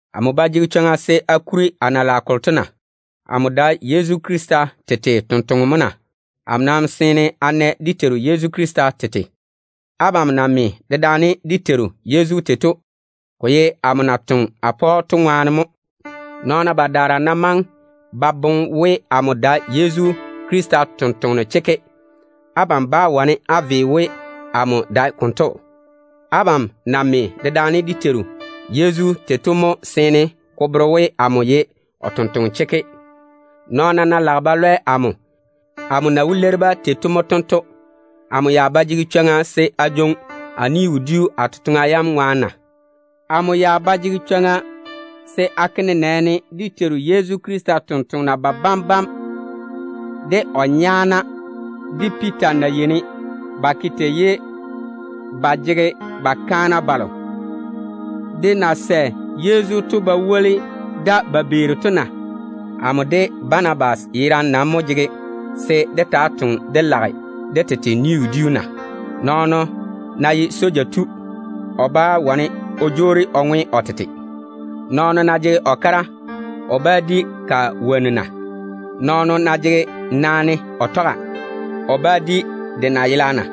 Amo ba jege chwoŋa se a kuri a na lage kolo to na? Amo dae Yezu Krista totoŋa nakwe mo na? A wo nɛ dé Teiru Yezu Krista tete mo na? Abam na me dedaane dé Teiru Yezu tei to, ko dae amo na toŋe a pa‑o to ŋwaane mo na? Nɔɔna badaara ná maŋe ba boŋe we, amo dae Yezu Krista totoŋa nakwe chekke, abam bá wane á ve we, amo dae konto. Abam na me dedaane dé Teiru Yezu tei to mo seene ko bere we, amo ye o tontoŋeno chekke. Nɔɔna ná lage ba bwei amo ba nii, amo na wó leiri-ba tei to mo tento: Amo ba jege chwoŋa se a jwoŋi a ni-wodiu a totoŋa yam baŋa ne na? Amo ba jege chwoŋa se a ke nenɛɛne dé Teiru Yezu totoŋa nakwa babam bam, de o nyaana, de Piita na yeini ba ke tei, ye ba jege ba kaana balo de na sɛ Yezu pa ba tɔge daane ba toŋe Wɛ totoŋa to na? Amo de Banabas yerane nam mo jege se dé taa toŋa dé lage dé tete ni-wodiu na? Nɔɔno ná ye soja tu, o bá wane o jwoori o ŋwe o tete. Nɔɔno ná jege o kara, o ba di ka wonnu na? Nɔɔno ná jege naane o tɔga, o ba di de nayela na?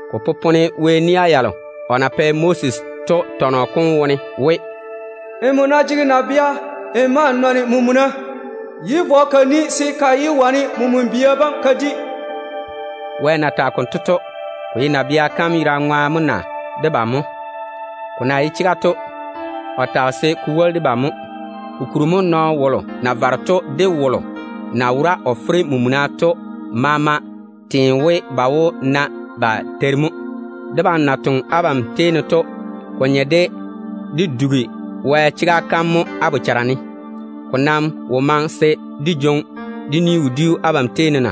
Ko popone Wɛ nia yalo o na pɛ Moses to tɔnɔ kom wone we, “Nmo ná jege nabea n ma n toŋe n faao, yé vɔ ka ni se ka yé di men-bia bam.” Wɛ bera yam konto zege nabɛ yerane ŋwaane mo na? Ko na ye chega to, o tage konto se ko woli debam mo. Ko bere we nɔɔno wolo na vare to de wolo na fere mena o le to maama teene we ba wó na ba teiri mo. Debam na toŋe abam tei ne to, ko nye de dé dugi Wɛ chega kam mo á bochara ne. Ko nam wo maŋe se dé jwoŋi dé ni-wodiu abam tei ne na?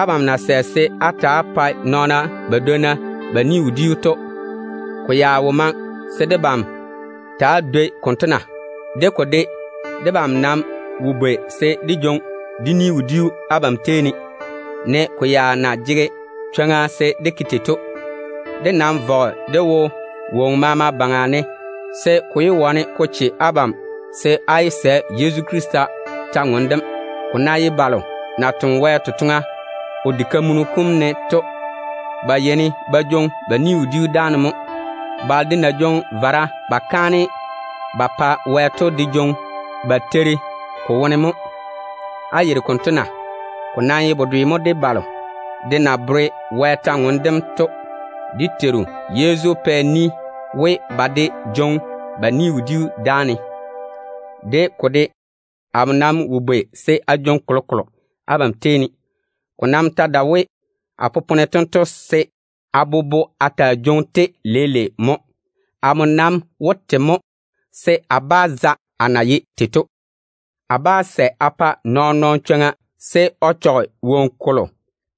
Abam na sɛ se á ta‑á pae nɔɔna badwonna ba ni-wodiu to, ko ya wo maŋe se debam ta dwoi konto na? De ko de, debam nam wo bwei se dé jwoŋi dé ni-wodiu abam tei ne, ne ko ya na jege chwoŋa se dé ke tei to. Dé nam vɔge dé wo woŋo maama baŋa ne, se ko yé wane ko kweele Yezu Krista kwor-ywoŋa kam ko yage tega ne. Ko ná ye balo na toŋe Wɛ totoŋa o diga kam ne to, ba yeini ba jwoŋi ba ni-wodiu dáane mo. Balo de na jwoŋi vara ba kaane ba pa Wɛ to de jwoŋi ba teiri ko wone mo. Á yeiri konto na? Ko nam ye bedwe mo de balo de na tɔɔle Wɛ kwor-ywoŋa kam to. Dé Teiru Yezu pɛ ni we, ba de jwoŋi ba ni-wodiu dáane. De ko de, amo nam wo bwei se a jwoŋi kolokolo abam tei ne. Ko nam ta dae we a popone tento se a bobo a taa jwoŋi-te leile mo. Amo nam wó te mo, se a bá za a na ye tei to. A bá sɛ a pa nɔɔn-nɔɔno chwoŋa se o chɔge woŋo kolo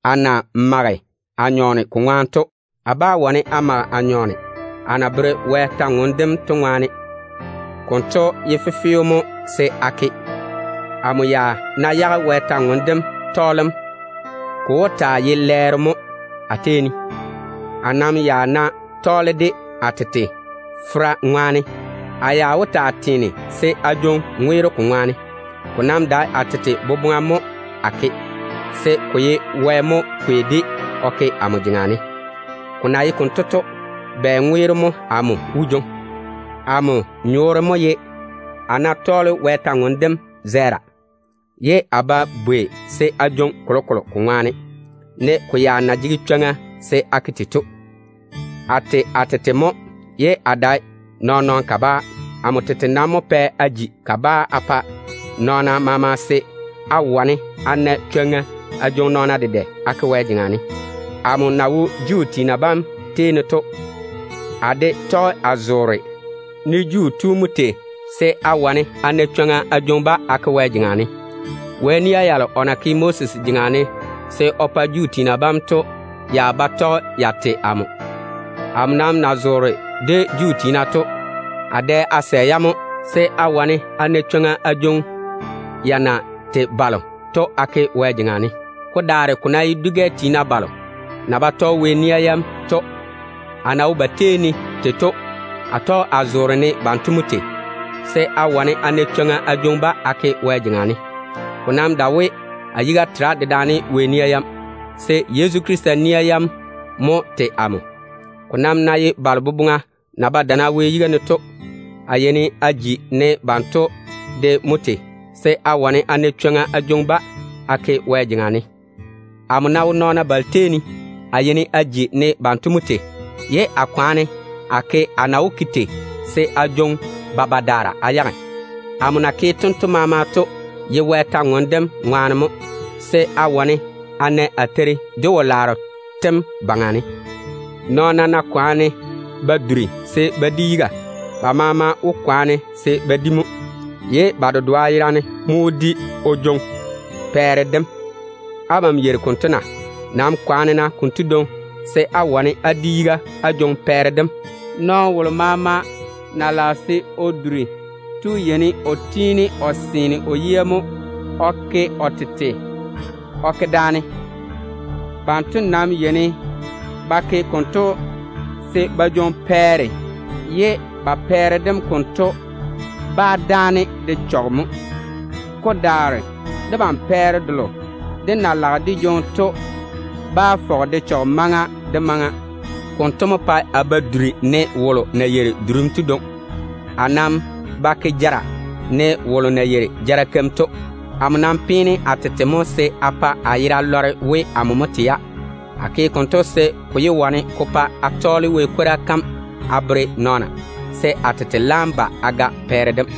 a na jege teera ko ŋwaane to. A nam bá wane a mage a nyɔɔne a na tɔɔle Wɛ kwor-ywoŋa kam to ŋwaane. Konto ye fefeo mo se a ke. Amo ya ná yage Wɛ kwor-ywoŋa kam tɔɔlem, ko wó taa ye lɛɛro mo a tei ne. A nam ya ná tɔɔle-ka a tete fera ŋwaane, a ya wó taa teene se a jwoŋi ŋweero ka baŋa ne. Ko nam dae a tete boboŋa mo a ke, se ko ye Wɛ mo kwei-de o ke amo jeŋa ne. Ko na ye konto to, bɛ ŋweero mo amo wó jwoŋi? Amo nyɔɔre mo ye we, a yeini a tɔɔle Wɛ kwor-ywoŋa kam zɛɛra, ye a ba bwei se a jwoŋi kolokolo ko ŋwaane, ne a ya na jege chwoŋa se a ke tei to. A tei a tete mo ye a dae nɔɔn-nɔɔno kabaa. Amo tete nam mo pɛ a ji kabaa a pa nɔɔna maama, se a wane a na chwoŋa a jwoŋi nɔɔna dedɛ a ke Wɛ jeŋa ne. Amo na wo Juu tiina bam tei ne to, a de tɔge a zoore ne Juu tu mo tei, se a wane a na chwoŋa a jwoŋi-ba a ke Wɛ jeŋa ne. Wɛ nia yalo o na tɔge Moses baŋa ne o pa Juu tiina bam to daa ba tei amo. Amo nam na zoore de Juu tiina to, a dɛ a sɛ-ya mo, se a wane a na chwoŋa a jwoŋi ya na tei balo to a ke Wɛ jeŋa ne. Ko daare ko ná ye dwi-gɛ tiina balo na ba tɔge Wɛ nia yam to, a na wo ba tei ne to, a tɔge a zoore ne banto mo tei, se a wane a na chwoŋa a jwoŋi-ba a ke Wɛ jeŋa ne. Ko nam dae we a yiga tera dedaane Wɛ nia yam, se Yezu Krista nia yam mo tei amo. Ko nam ná ye balo boboŋa na wo kweere Wɛ seeni to, a yeini a ji ne banto de mo tei, se a wane a na chwoŋa a jwoŋi-ba a ke Wɛ jeŋa ne. Amo ná wo nɔɔna balo maama tei ne, a yeini a ji ne banto mo tei, ye a kwaane a ke a na wó ke tei se a jwoŋi ba badaara a yage. Amo na ke tei maama to ye Wɛ kwor-ywoŋa kam ŋwaane mo, se a wane a na a teiri ka wo-laaro tem baŋa ne. Nɔɔna ná kwaane ba duri se ba di yiga, ba maama wó kwaane se ba di mo, ye ba dedoa yerane mo wó di o jwoŋi pɛɛre dem. Abam yeiri konto na? Nam kwaane-na konto dwoŋi se á wane á di yiga á jwoŋi pɛɛre dem. Nɔɔno wolo maama na lage se o duri to yeini o tiini o seene o yia mo o ke o tete o ke daane. Banto nam yeini ba ke konto se ba jwoŋi pɛɛre, ye ba pɛɛre dem konto bá dáane de chɔge mo. Ko daare debam pɛɛre delo dé na lage dé jwoŋi to bá fɔge de chɔge maŋa de maŋa. Konto mo pae a ba yeini a duri ne wolo na duri yɔɔ yɔɔ to dwoŋi. A nam ba ke jara ne wolo na yeiri jara keim to. Amo nam peene a tete mo se a pa a yera lɔre we, amo mo tei-ya. A ke konto se ko yé wane ko pa a tɔɔle Wɛ kwora kam a bere nɔɔna, se a tete laam ba a ga pɛɛre dem.